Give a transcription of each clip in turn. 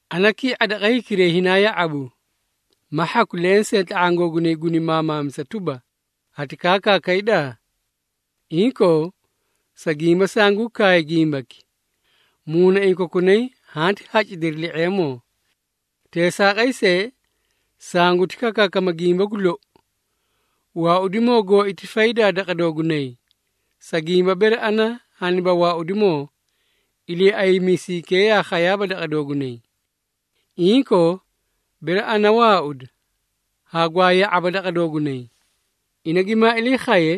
Ana ki⁄a daqa hikiray hinaa ya⁄abu, ma hhaku lensee tla⁄aã googunay guni maamaamisa tuba, ‘Hati kaakaakayda?’ Inkoo, sa gimba sanguu kaay gimbaki, muunaiĩ kokunay hanti hacidiri li⁄eemoo. Teesaaqay see, sanguti kakaakama gimba gu lou, waaudimoo gooi ti faydaa daqa doogunay, sa gimba bere ana haniba waaudimoo, Iliiaymiisaykee yaa khayaaba daqa doogunay. Inkoo, bere ana waauda, hagwaa ya⁄aba daqa doogunay. Ina gimaa ilii khaye,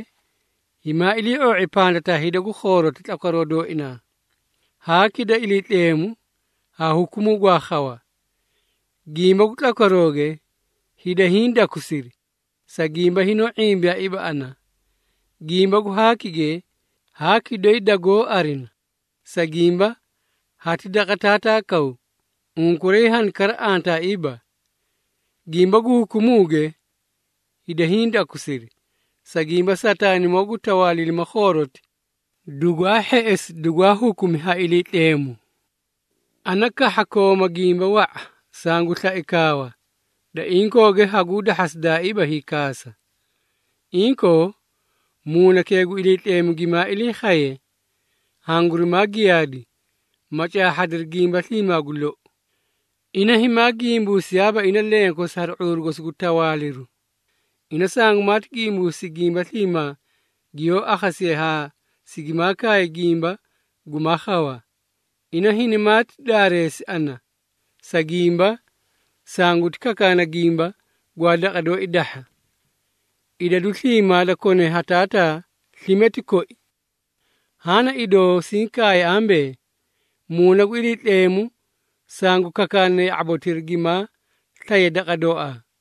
himaa ilii⁄oo⁄i pandataa hida gu khooroti tlakwaroo dooina, haaki da Iliitleemu, haa hukumuu gwaa khawa. Gimba gu tlakwarooge, hida hiĩ dakusiri, sa gimba hinoó ⁄imbiyaaiiba ana. Gimba gu haakige, haaki doyi dagoó arina, sa gimba hati daqa Taataa kaw, unkuray hani kara antaaiiba. Gimba gu hukumuuge, hida hiĩ dakusiri, sa gimba Sataanimoo gu tawaaliilima khooroti, dugwaa hheꞌesi dugwaa hukumi ha Iliitleemu. Ana kahha kooma gimba wa⁄a, sangu slae kaawa, da inkooge haguu dahhasidaaiiba hiikaasa. Inkoo, Muunakee gu Iliitleemu gimaa ilii khaye, hangurimaa giyaadi, ma caahhadiri gimba sliimaa gu lou. Ina himaa gimbuusiyaaba ina lenkosi hari ⁄uuru gosi gu tawaaliru, ina sangumaati gimbuusi gimba sliimaa giyoó akhasiye haa sigimaa kaay gimba gumaa khawa. Ina hinimaati daareesi ana, sa gimba sanguti kakaana gimba, gwaa daqa dooi dahha. Idadu sliimaa da kone haa Taataa slime ti koi. Haã na idoo siĩ kaay ambee, Muuna gu Iliitleemu sangu kakaana ya⁄abotira gimaa slaye daqa dooaa.”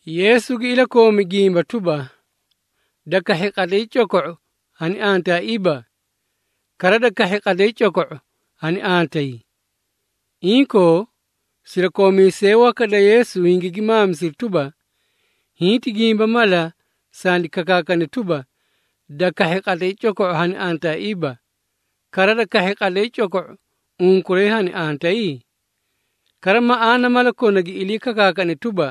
Yeesu gi ilakoomi gimba tuba, “Da kahhi qatlay coko⁄u, hani antaaiiba, kara da kahhi qatlay coko⁄u hani antayi.” Inkoo, sirakoomiisee waka da Yeesu hingigi maamisiri tuba, “Hiĩ ti gimba mala sandi kakaakane tuba, ‘Da kahhi qatlay coko⁄u hani antaaiiba, kara da kahhi qatlay coko⁄u unkuray hani antayi?’ Kara maꞌaana mala kona gi ilii kakaakane tuba,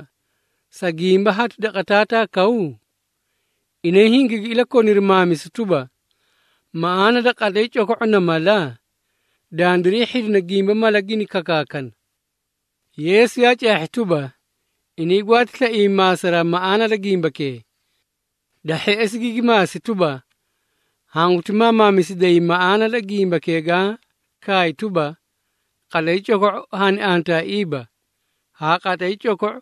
‘Sa gimba hati daqa Taataa kaw?’” Inay hingigi ilakoniri maamisu tuba, “Maꞌaana da ‘qatlay coko⁄u’ na mala? Dandiray hhidina gimba mala gini kakaakana.” Yeesu yaa caahhi tuba, inay gwaati slaiyay maasa maꞌaana da gimbakee. Da hheꞌesi gigi maasi tuba, “Hanguti maamaamisiday maꞌaana da gimbakee gaã kaay tuba, qatlay coko⁄u hani antaaiiba, haa qatlay coko⁄u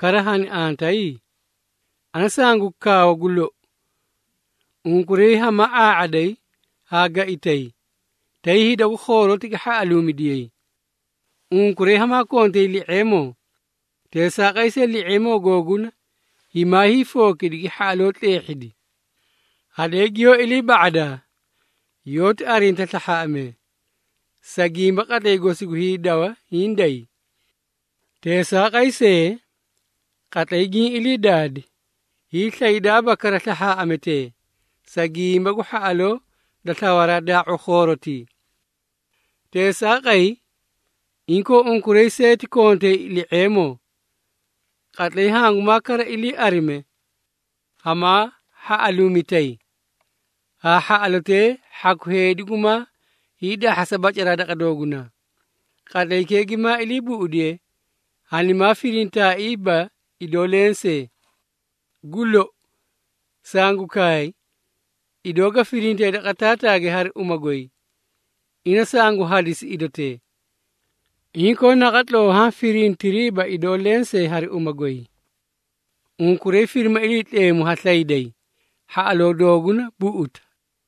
kara hani antayi? Ana sangu kaawa gu lou, unkuray hamaa ⁄aa⁄aday haa gaitay, tay hida gu khooroti gi hhaꞌaluumidiyay. Unkuray hamaa kontay li⁄eemoo teesaaqay see li⁄eemoo googuna, himaa hiifookidi gi hhaꞌaloo tleehhidi. Hadee giyoó ilii ba⁄adaa, yoóti arinta slahhaaꞌamee, sa gimba qatlay gosi gu hiidawa hiĩ day. Teesaaqay see, qatlay giĩ ilii daadi, hiislaydaaba kara slahhaaꞌametee, sa gimba gu hhaꞌaloo da slawaraa daa⁄u khoorotii. Teesaaqay, inkoo unkuray see ti kontay li⁄eemoo. Qatlay, hangumaa kara ilii arime, hamaa hhaꞌaluumitay, haa hhaꞌalotee hhaku heedi gumaa hiidahhasa bacaraa daqa doogunaa. Qatlaykee gimaa ilii buꞌudiye, hanimaa firintaaiiba idoo lensee. Gu lou, sangu kaay, idoo ga firintee daqa Taataage hari uma goy, ina sangu hadisi idotee. Inkoo naqatloo haã firintiriiba idoo lensee hari uma goy. Unkuray firima Iliitleemu ha slayday, hhaꞌaloo dooguna buꞌuta.”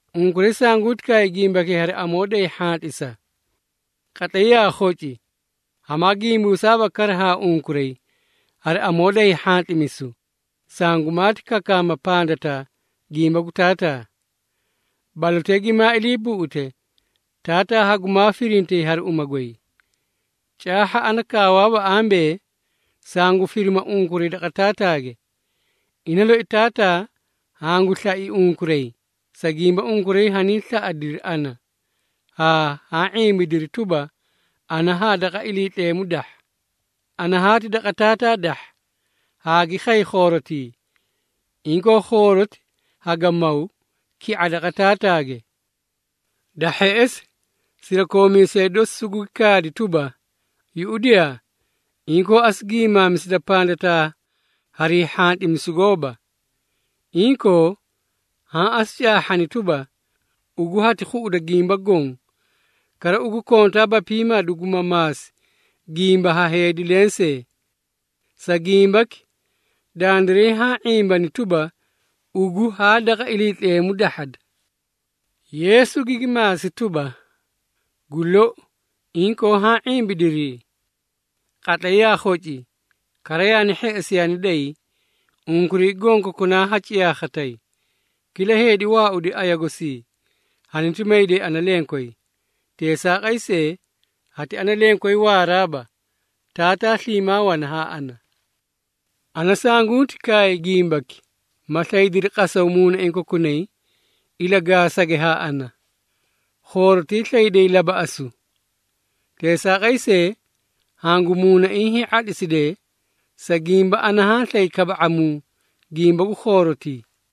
“Unkuray sanguti kaay gimbakee hari amoo day hhantlisa. Qatlay yaa khoci, hamaa gimbuusaaba kara haa unkuray hari amoo da hiihhantlimisu, sangumaati kakaama pandataa gimba gu Taataa. Balotee gimaa ilii buꞌute, Taataa hangumaa firintay hari uma goy. Caahha ana kaawaaba ambee, sangu firima unkuray daqa Taataage. Ina loi Taataa hangu slai unkuray, sa gimba unkuray hanii slaꞌadiri ana, haa haã ⁄imbidiri tuba, ana haa daqa Iliitleemu dahha. Ana haati daqa Taataa dahha, haagi khay khoorotii. Inkoo, khooroti haga maw, ki⁄a daqa Taataage.” Da hheꞌesi, sirakoomiisee dosi sugugi kaadi tuba, “Yuꞌudiyaa, inkoo asu gimaamisida pandataa harii hhantlimisu gooba. Inkoo, haã asu caahhani tuba, ugu hati khuꞌuda gimba goõ, kara ugu kontaaba piimaa duguma maasi gimba ha heedi lensee. Sa gimbaki, dandiray haã ⁄imbana tuba, ugu haa daqa Iliitleemu dahhada.” Yeesu gigi maasi tuba, “Gu lou, inkoo haã ⁄imbidirii? Qatlay yaa khoci, kara yaani hheꞌesi yaani day, unkuray gonkokunaa ha ciyaakhatay, kila heedi waaudi aya gosii, haniti mayday ana lenkway. Teesaaqay see, hati ana lenkway waaraaba, Taataa sliimaa wana haa ana. Ana sanguti kaay gimbaki, ma slaydiri qasaw muunaiĩ kokunay ilagaasage haa ana. Khooroti slayday labaꞌasu. Teesaaqay see, hangu muunaiĩ hii⁄atlisidee, sa gimba ana haã slay kaba⁄amuu gimba gu khoorotii.”